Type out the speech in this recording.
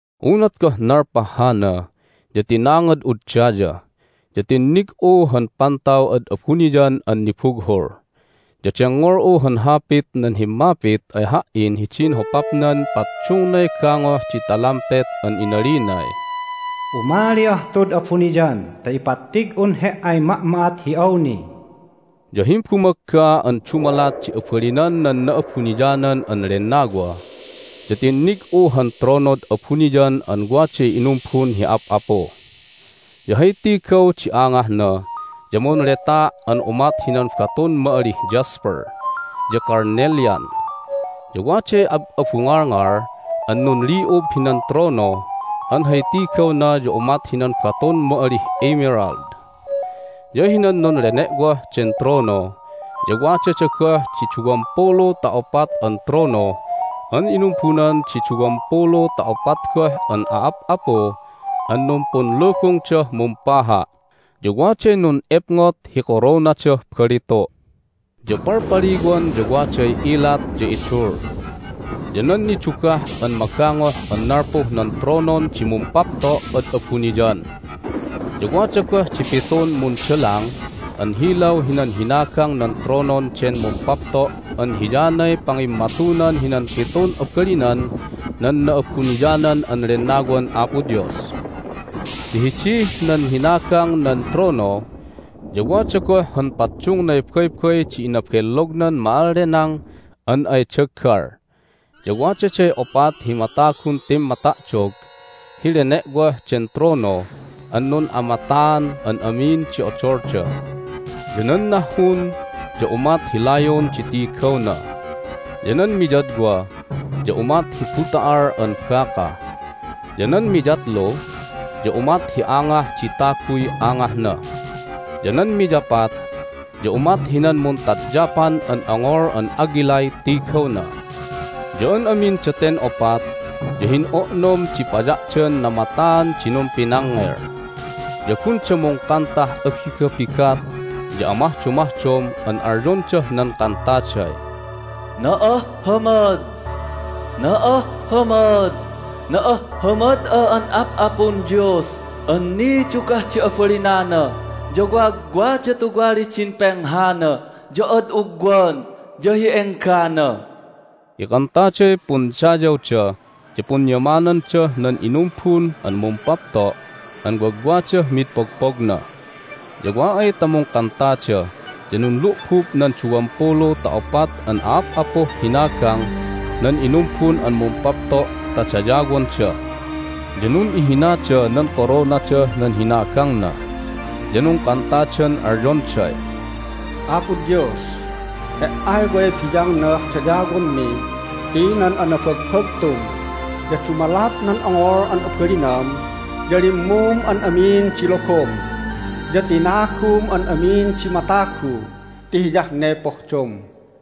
Unat goh nalpah hana ya tinangad'ud daya, ya tinnig'u han pantaw ad abuniyan an nibughul. Ya dengngol'u han hapit nan himmapit ay ha"in hidin hopapnan paddungnay gangoh di talampet an inalinay, "Umali'ah tud abuniyan ta ipattig'un he"ay ma'ma'at hi awni." Ya himbumagga an dumalat di abalinan nan Na'abuniyanan an Lennawa ya tinnig'u han tronod abuniyan an waday inumbun hi ap'apu. Ya hay tigaw di angahna ya munletaa' an umat hinan batun ma'alih jasper ya carnelian. Ya waday ab'abungalngal an nunli'ub hinan trono an hay tigawna ya umat hinan batun ma'alih emerald. Ya hinan nunlene'woh den trono ya wadada goh di duwampulu ta opat an trono an inumbunan di duwampulu ta opat goh an a'ap'apu an numpunlubungdah mumpaha', ya waday nun'epngot hi koronadah balitu'. Ya palpaliwan ya waday ilat, ya idul, ya nan nidugah an magangoh an nalpuh nan tronon di Mumpapto' ad abuniyan. Ya wada goh di pitun mundalang an hilaw hinan hinagang nan tronon den Mumpapto' an hiyanay pangimmatunan hinan pitun abalinan nan Na'abuniyanan an Lennawan Apo Dios. Ya hidih nan hinagang nan trono ya wada goh han paddungnay baybay di inabellognan ma'allenang an ay daggal. Ya wadaday opat hi matagun timmata'dog hi lene'woh den trono an nun'amataan an amin di odolda. Ya nan nahhun ya umat hi layon di tigawna, ya nan miyadwa ya umat hi buta'al an baka, ya nan miyatlu ya umat hi angah di taguy angahna, ya nan miyapat ya umat hinan muntadyapan an ongol an agilay tigawna. Ya an amin daten opat ya hin'o'nom di paya'dan namataan di numpinangngel. Ya gunda mungkantah abigabigat ya amahdomahdom an alyondah nan kantaday, "Na'ahhamad, na'ahhamad, na'ahhamad'a an Ap'apun Dios an nidugah di abalinana, ya wagwada tuwalih din penghana, ya ad ugwan, ya hi enggana!" Ikantaday pundayawda ya punyamanandah nan inumbun an Mumpapto' an wagwadah mid pogpogna. Ya wa ay ta mungkantada ya nunlu'bub nan duwampulu ta opat an a'ap'apuh hinagang nan inumbun an Mumpapto' ta dayawonda. Ya nun'ihinada nan koronadah nan hinagangna, ya nungkantadan alyonday, "Apo Dios, He"ay way biyangnah dayawonmi ti nan anabagbagtum, ya dumalat nan ongol an abalinam ya limmum an amin di logom, ya tinagum an amin di matagu ti hiyah ne pohdom."